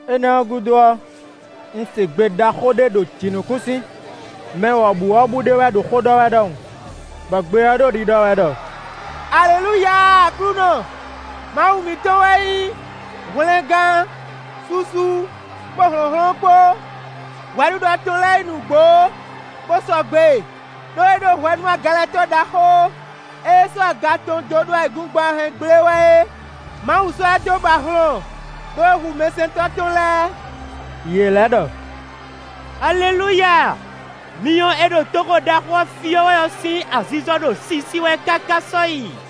Énɛ́ ɔ́ gúdo ɔ́, un se gbe ɖaxó ɖé ɖo jǐnukúnsin, mɛ wɔ̌buwɔ́bú ɖé wɛ ɖo xó ɖɔ wɛ ɖɔhun, bɔ gbe ɔ́ ɖo ɖiɖɔ wɛ ɖɔ: “Alelúya Aklúnɔ! Mawu mǐtɔn tɔn wɛ nyí hwlɛngán, susu, kpó hlɔ̌nhlɔ́n kpó! Hwɛɖiɖɔ tɔn lɛ́ɛ nyí nǔgbó, bó sɔgbe! Đó é ɖó hwɛ nú agalɛtɔ́ ɖaxó e sɔ́ aga tɔn dó ɖo ayǐkúngban ɔ́ hɛn gblé wɛ é. Mawu sɔ́ ɛ dó ba hlɔn, ɖó é hu mɛsɛntɔ́ tɔn lɛ́ɛ.” Yě lɛ́ ɖɔ: “Alelúya! Myɔ e ɖo toxo ɖaxó ɔ́ fyɔ́ wɛ ɔ́ sín azizɔ ɖo sisi wɛ káká sɔ́yi.”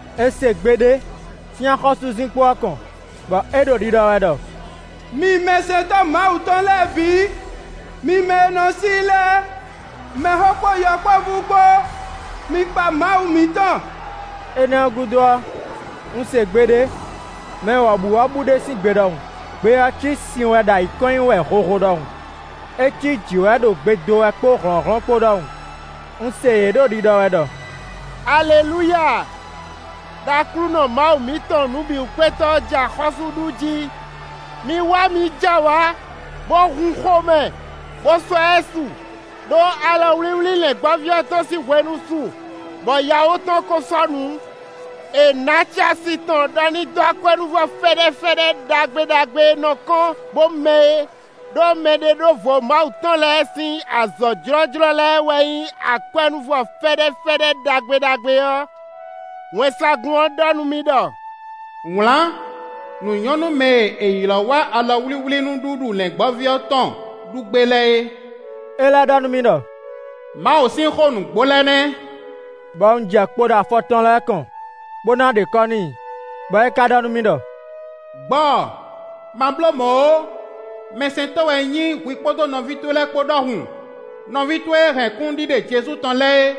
È se gbe ɖé sín axɔ́súzinkpo ɔ́ kɔn, bɔ é ɖo ɖiɖɔ wɛ ɖɔ: “Mi mɛsɛntɔ́ Mawu tɔn lɛ́ɛ bǐ; mi mɛ e nɔ sí i lɛ́ɛ, mɛxó kpó yɔkpɔ́vú kpó, mi kpa Mawu mǐtɔn.” Énɛ́ ɔ́ gúdo ɔ́, un se gbe ɖé mɛ wɔ̌buwɔ́bú ɖé sín gbe ɖɔhun; gbe ɔ́ cí sin wɛ ɖo ayǐ kɔn nyi wɛ hoho ɖɔhun; é cí jǐ wɛ ɖo gbe dó wɛ kpó hlɔ̌nhlɔ́n kpó ɖɔhun; un se yě ɖo ɖiɖɔ wɛ ɖɔ: “Alelúya! Đó Aklúnɔ Mawu mǐtɔn Nǔbǐwúkpétɔ́ ɔ́ jɛ axɔ́sú ɖu jí! Mi wá mǐ jɛ awǎ, bó hun xomɛ, bó sɔ́ ɛ su! Đó alɔwlíwlí Lɛ̌ngbɔ́ví ɔ́ tɔn sín hwenu su, bɔ yawó tɔn ko sɔ́ nǔ. È nǎ acɛ asi tɔn ɖɔ ní dó akwɛ́núvɔ fɛ́ɖɛ́fɛ́ɖɛ́ ɖagbe ɖagbe e nɔ kɔ́n, bó mɛ́ é.” Đó mɛɖeɖóvo Mawu tɔn lɛ́ɛ sín azɔ̌ jlɔ́jlɔ́ lɛ́ɛ wɛ nyí akwɛ́núvɔ fɛ́ɖɛ́fɛ́ɖɛ́ ɖagbe ɖagbe ɔ́. Wɛnsagun ɔ́ ɖɔ nú mì ɖɔ: “Wlǎn: nǔ nyɔ́ nú mɛ e è ylɔ̌ wá alɔwlíwlínúɖuɖu Lɛ̌ngbɔ́ví ɔ́ tɔn ɖu gbé lɛ́ɛ é.” É lɛ́ ɖɔ nú mì ɖɔ: “Mawu sín xó nǔgbó lɛ́ɛ nɛ́.” Bɔ un jɛ kpo ɖo afɔ tɔn lɛ́ɛ kɔn, bó ná ɖe kɔ́ n'i, bɔ é ka ɖɔ nú mì ɖɔ: “Gbɔ! Ma bló mɔ̌ ó! Mɛsɛntɔ́ wɛ un nyí hwi kpó nɔví towe lɛ́ɛ kpó ɖɔhun; nɔví towe e hɛn kúnnuɖiɖe Jezu tɔn lɛ́ɛ é.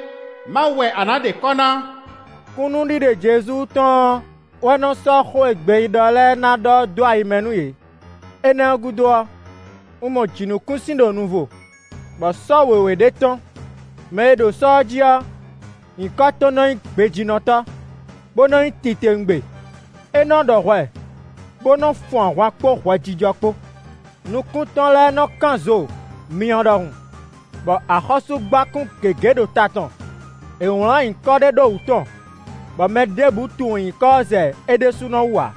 Mawu wɛ a nǎ ɖe kɔ́ ná!” Kúnnuɖiɖe Jezu tɔn ɔ́ wɛ nɔ sɔ́ xó e gbeyíɖɔ lɛ́ɛ ná ɖɔ ɔ́ dó ayi mɛ nú yě. Énɛ́ ɔ́ gúdo ɔ́, un mɔ jǐnukúnsin ɖo nuvo, bɔ sɔ́ wěwé ɖé tɔ́n. Mɛ e ɖo sɔ́ ɔ́ jí ɔ́, nyǐkɔ tɔn nɔ nyí Gbejínɔtɔ́, bó nɔ nyí Titewungbe; é nɔ́ ɖɔ hwɛ bó nɔ́ fun ahwan kpó hwɛjijɔ kpó. Nukún tɔn lɛ́ɛ nɔ kán zo myɔ ɖɔhun, bɔ axɔ́súgbákún gěgé ɖo ta tɔn. È wlǎn nyǐkɔ ɖé ɖó wǔ tɔn, bɔ mɛ ɖěbǔ tunwun nyǐkɔ ɔ́ zɛ é ɖésúnɔ wú ǎ.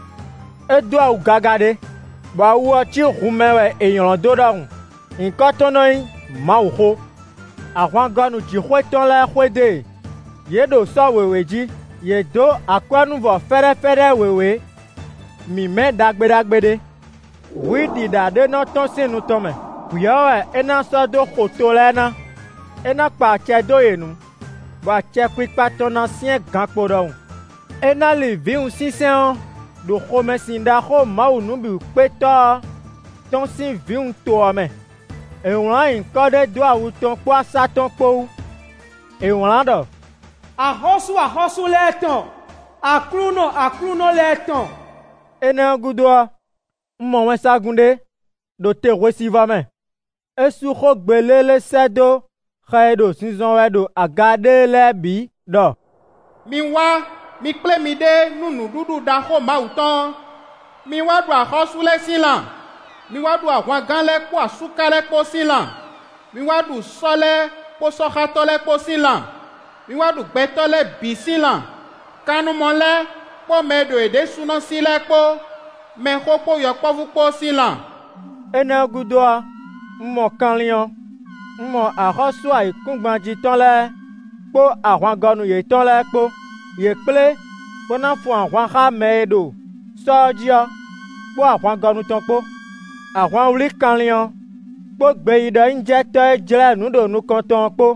É dó awu gaga ɖé, bɔ awu ɔ́ cí hun mɛ wɛ è nylɔ̌ dó ɖɔhun; nyǐkɔ tɔn nɔ nyí “Mawuxó”. Ahwangɔnu jǐxwé tɔn lɛ́ɛ xwedó e; yě ɖo sɔ́ wěwé jí; yě dǒ akwɛ́núvɔ fɛ́ɖɛ́fɛ́ɖɛ́ wěwé mímɛ́ ɖagbe ɖagbe ɖé. Hwǐ ɖíɖá ɖé nɔ tɔ́n sín nu tɔn mɛ; hwǐ ɔ́ wɛ é ná sɔ́ dó xo to lɛ́ɛ ná. É ná kpa acɛ dó yě nu, bɔ acɛkpikpa tɔn ná syɛ́n gankpo ɖɔhun; é ná li vǐwun sínsɛ́n ɔ́ ɖo xomɛsin ɖaxó Mawu Nǔbǐwúkpétɔ́ ɔ́ tɔn sín vǐwunto ɔ́ mɛ. È wlǎn nyǐkɔ ɖé dó awu tɔn kpó asá tɔn kpó wú; è wlǎn ɖɔ: “Axɔ́sú axɔ́sú lɛ́ɛ tɔn; Aklúnɔ aklúnɔ lɛ́ɛ tɔn.” Énɛ́ ɔ́ gúdo ɔ́, un mɔ wɛnsagun ɖé ɖo te hwesivɔ́ mɛ. É sú xó gbe lélé sɛ́ dó xɛ e ɖo zinzɔn wɛ ɖo aga ɖéé lɛ́ɛ bǐ ɖɔ: “Mi wá; mi kplé miɖée nú nǔɖuɖu ɖaxó Mawu tɔn ɔ́! Mi wá ɖu axɔ́sú lɛ́ɛ sín lan; mi wá ɖu ahwangán lɛ́ɛ kpó asúká lɛ́ɛ kpó sín lan; mi wá ɖu sɔ́ lɛ́ɛ kpó sɔ́xátɔ́ lɛ́ɛ kpó sín lan; mi wá ɖu gbɛtɔ́ lɛ́ɛ bǐ sín lan; kannumɔ lɛ́ɛ kpó mɛ e ɖo yě ɖésúnɔ sí lɛ́ɛ kpó, mɛxó kpó yɔkpɔ́vú kpó sín lan.” Énɛ́ ɔ́ gúdo ɔ́, un mɔ kanlin ɔ́; un mɔ axɔ́sú ayǐkúngban jí tɔn lɛ́ɛ kpó ahwangɔnu yětɔn lɛ́ɛ kpó; yě kplé bó ná fun ahwan xá mɛ e ɖo sɔ́ ɔ́ jí ɔ́ kpó ahwangɔnu tɔn kpó. Ahwan wlí kanlin ɔ́ kpó gbeyíɖɔnyíjɛtɔ́ e jlɛ́ nǔ ɖo nukɔn tɔn ɔ́ kpó.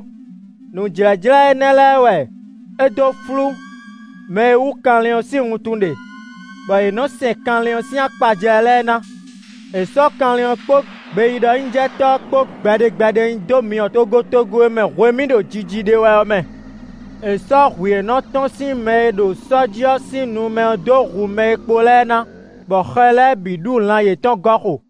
Nǔjlɛ́jlɛ́ énɛ́ lɛ́ɛ wɛ é dó flú mɛ e wú kanlin ɔ́ sín wuntun ɖe, bɔ yě nɔ́ sɛn kanlin ɔ́ sín akpajlɛ́ lɛ́ɛ ná. È sɔ́ kanlin ɔ́ kpó gbeyíɖɔnyíjɛtɔ́ ɔ́ kpó gbɛɖe gbɛɖe nyi dó myɔ togotogo e mɛ hwemí ɖo jiji ɖe wɛ ɔ́ mɛ. È sɔ́ hwǐ e nɔ tɔ́n sín mɛ e ɖo sɔ́ jí ɔ́ sín nu mɛ ɔ́ dó hu mɛ e kpo lɛ́ɛ ná, bɔ xɛ lɛ́ɛ bǐ ɖu lan yětɔn gɔ́ xo.